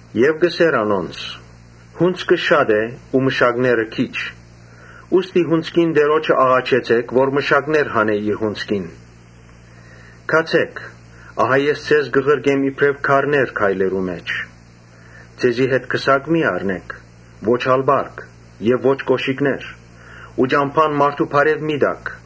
Եւ ըսաւ անոնց. «Հունձքը շատ է բայց մշակները քիչ. ուստի հունձքին Տէրոջը աղաչեցէք որ մշակներ հանէ իր հունձքին։ Գացէք. ահա ես ձեզ կը ղրկեմ իբրեւ գառներ գայլերու մէջ։ Ձեզի հետ քսակ մի՛ առնէք, ո՛չ ալ պարկ եւ ո՛չ կօշիկներ ու ճամբան մարդու բարեւ մի՛ տաք։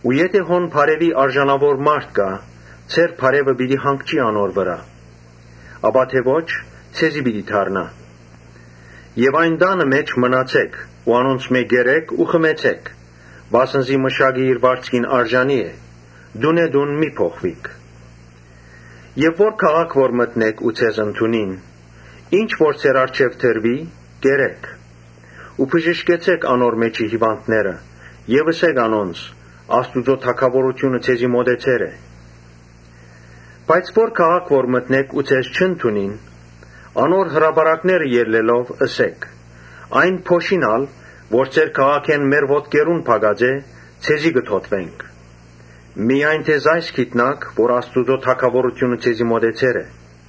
Եթէ հոն բարեւի արժանի մարդ կայ, ձեր բարեւը պիտի հանգչի անոր վրայ, ապա թէ ոչ՝ ձեզի պիտի դառնայ։ Այն տանը մէջ մնացէք ու անոնց քով կերէք ու խմեցէք, վասն զի մշակը իր վարձքին արժանի է։ Տունէ տուն մի՛ փոխուիք։ Ո՛րմէկ քաղաք որ մտնէք ու ձեզ ընդունին, ինչ որ ձեր առջեւ դրուի՝ կերէք. Ու բժշկեցէք անոր մէջի հիւանդները եւ ըսէք անոնց. ‘Աստուծոյ թագաւորութիւնը ձեզի մօտեցեր է’։ Բայց ո՛րմէկ քաղաք որ մտնէք ու ձեզ չընդունին, անոր հրապարակները ելլելով՝ ըսէք. ‘Այն փոշին ալ որ ձեր քաղաքէն մեր ոտքերուն փակած է, ձեզի կը թօթուենք. միայն թէ այս գիտցէք, որ Աստուծոյ թագաւորութիւնը ձեզի մօտեցեր է’։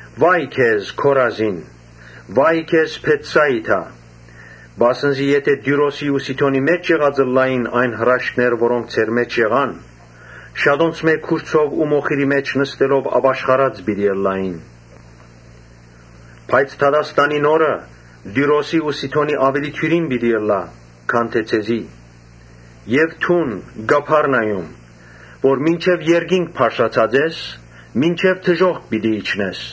«Վա՜յ քեզի, Քորազին, վա՜յ քեզի, Բեթսայիդա, վասն զի եթէ Տիւրոսի ու Սիդոնի մէջ եղած ըլլային այն հրաշքները որոնք ձեր մէջ եղան, շատունց քուրձով ու մոխիրի մէջ նստելով ապաշխարած պիտի ըլլային։ Բայց դատաստանին օրը Տիւրոսին ու Սիդոնին աւելի դիւրին պիտի ըլլայ, քան թէ՝ ձեզի։ Եւ դո՛ւն, Կափառնայում, որ մինչեւ երկինք բարձրացած ես, մինչեւ դժոխք պիտի իջնես։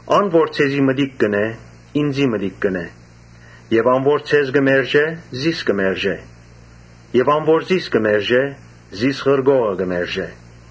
Ան որ ձեզի մտիկ կ’ընէ, ինծի մտիկ կ’ընէ եւ ան որ ձեզ կը մերժէ, զիս կը մերժէ. եւ ան որ զիս կը մերժէ, զիս ղրկողը կը մերժէ»։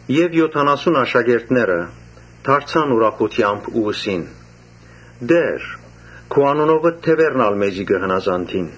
Եօթանասունըերկու աշակերտները դարձան ուրախութեամբ ու ըսին. «Տէ՛ր, քու անունովդ դեւերն ալ մեզի կը հնազանդէին»։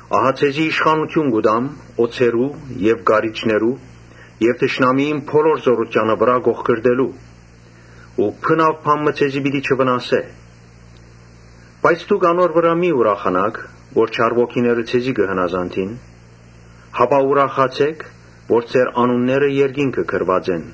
Ահա ձեզի իշխանութիւն կու տամ օձերու եւ կարիճներու եւ թշնամիին բոլոր զօրութեանը վրայ կոխկռտելու ու բնաւ բան մը ձեզի պիտի չվնասէ։ Բայց դուք անոր համար մի՛ ուրախանաք, որ չար ոգիները ձեզի կը հնազանդին, հապա ուրախացէք որ ձեր անունները երկինքը գրուած են»։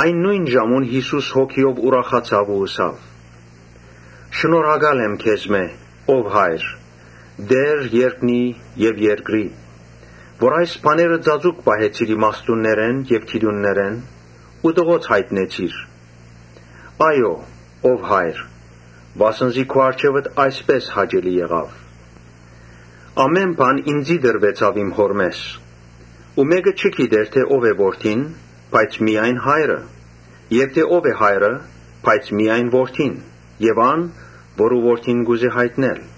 Նոյն ժամուն Յիսուս Հոգիով ուրախացաւ ու ըսաւ. «Շնորհակալ եմ քեզմէ, ո՛վ Հայր, Տէր երկնի եւ երկրի, որ այս բաները ծածուկ պահեցիր իմաստուններէն եւ գիտուններէն ու տղոց յայտնեցիր։ Այո՛, ո՛վ Հայր, վասն զի քու առջեւդ այսպէս հաճելի եղաւ։ Ամէն բան ինծի տրուեցաւ իմ Հօրմէս ու մէ՛կը չի գիտեր թէ ո՞վ է Որդին, բայց միայն Հայրը եւ թէ ո՞վ է Հայրը, բայց միայն Որդին եւ ան՝ որուն Որդին կ’ուզէ յայտնել»։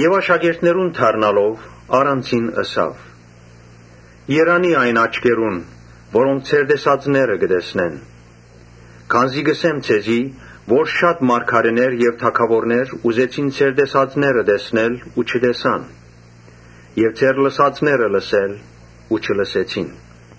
Աշակերտներուն դառնալով՝ առանձին ըսաւ. «Երանի՜ այն աչքերուն՝ որոնք ձեր տեսածները կը տեսնեն Քանզի կ’ըսեմ ձեզի, թէ շատ մարգարէներ եւ թագաւորներ ուզեցին ձեր տեսածները տեսնել, բայց չտեսան եւ ձեր լսածները լսել, բայց չլսեցին»։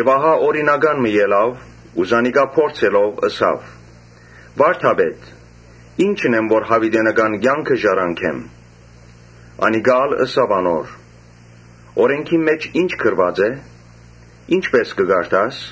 Ահա օրինական մը ելաւ ու զանիկա փորձելով՝ ըսաւ. «Վա՛րդապետ, ի՞նչ ընեմ որ յաւիտենական կեանքը ժառանգեմ»։ Անիկա ալ ըսաւ անոր. «Օրէնքին մէջ ի՞նչ գրուած է, ի՞նչպէս կը կարդաս»։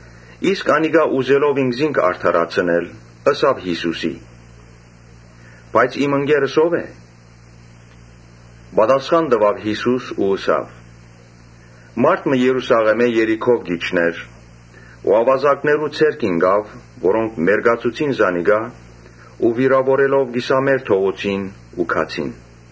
Իսկ օրինականը, ուզելով ինքզինք արդարացնել, ըսաւ Յիսուսին. «Բայց իմ ընկերս ո՞վ է»։ Պատասխան տուաւ Յիսուս ու ըսաւ. «Մարդ մը Երուսաղէմէն Երիքով կ’իջնէր ու աւազակներու ձեռք ինկաւ, որոնք մերկացուցին զանիկա ու վիրաւորելով կիսամեռ թողուցին ու գացին։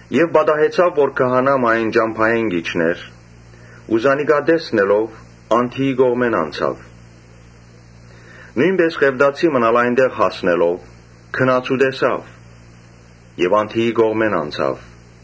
Պատահեցաւ որ քահանայ մը այն ճամբայէն իջնէ ու զանիկա տեսնելով անդիի կողմէն անցաւ։ Նոյնպէս Ղեւտացի մըն ալ այնտեղ հասնելով՝ գնաց ու տեսաւ եւ անդիի կողմէն անցաւ։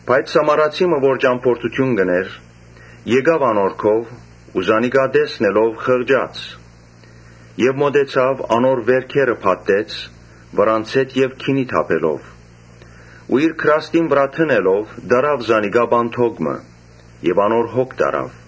Բայց Սամարացի մը, որ ճամբորդութիւն կ’ընէր, եկաւ անոր քով ու զանիկա տեսնելով խղճաց։ Մօտեցաւ, անոր վէրքերը փաթթեց, վրան ձէթ եւ գինի թափելով ու իր գրաստին վրայ դնելով՝ տարաւ զանիկա պանդոկ մը եւ անոր հոգ տարաւ։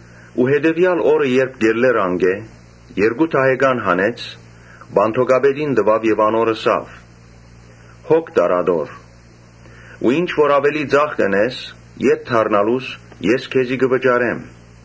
Հետեւեալ օրը, երբ կ’ելլէր անկէ, երկու դահեկան հանեց՝ պանդոկապետին տուաւ եւ անոր ըսաւ. «Հոգ տար ատոր ու ինչ որ աւելի ծախք ընես, ետ դառնալուս ես քեզի կը վճարեմ»։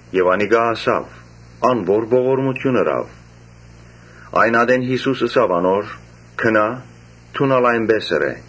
Անիկա ըսաւ. «Ա՛ն, որ ողորմութիւն ըրաւ»։ Այն ատեն Յիսուս ըսաւ անոր. «Գնա՛, դուն ալ այնպէս ըրէ»։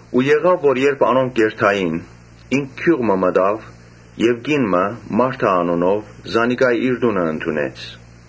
Երբ անոնք կ’երթային, ինք գիւղ մը մտաւ եւ կին մը, Մարթա անունով, զանիկա իր տունը ընդունեց։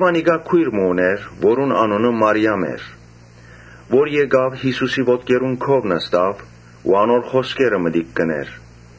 Անիկա քոյր մը ունէր, որուն անունը Մարիամ էր, որ եկաւ Յիսուսին ոտքերուն քով նստաւ, անոր խօսքերը մտիկ կ’ընէր։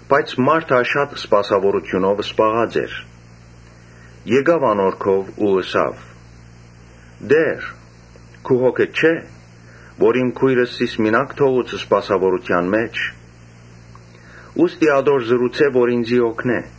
Բայց Մարթա սպասաւորութիւնով շատ զբաղած էր։ Եկաւ անոր քով ու ըսաւ. «Տէ՛ր, քու հոգդ չէ՞, որ իմ քոյրս զիս մինակ թողուց սպասաւորութեան մէջ. ուստի ատոր ըսէ, որ ինծի օգնէ»։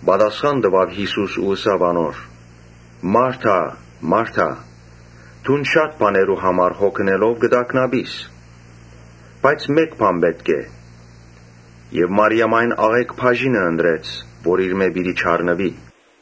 Պատասխան տուաւ Յիսուս ու ըսաւ անոր. «Մարթա՛, Մարթա՛, դուն շատ բաներու համար հոգ ընելով կը տագնապիս. Բայց մէ՛կ բան պէտք է եւ Մարիամ այն աղէկ բաժինը ընտրեց, որ իրմէ պիտի չառնուի»։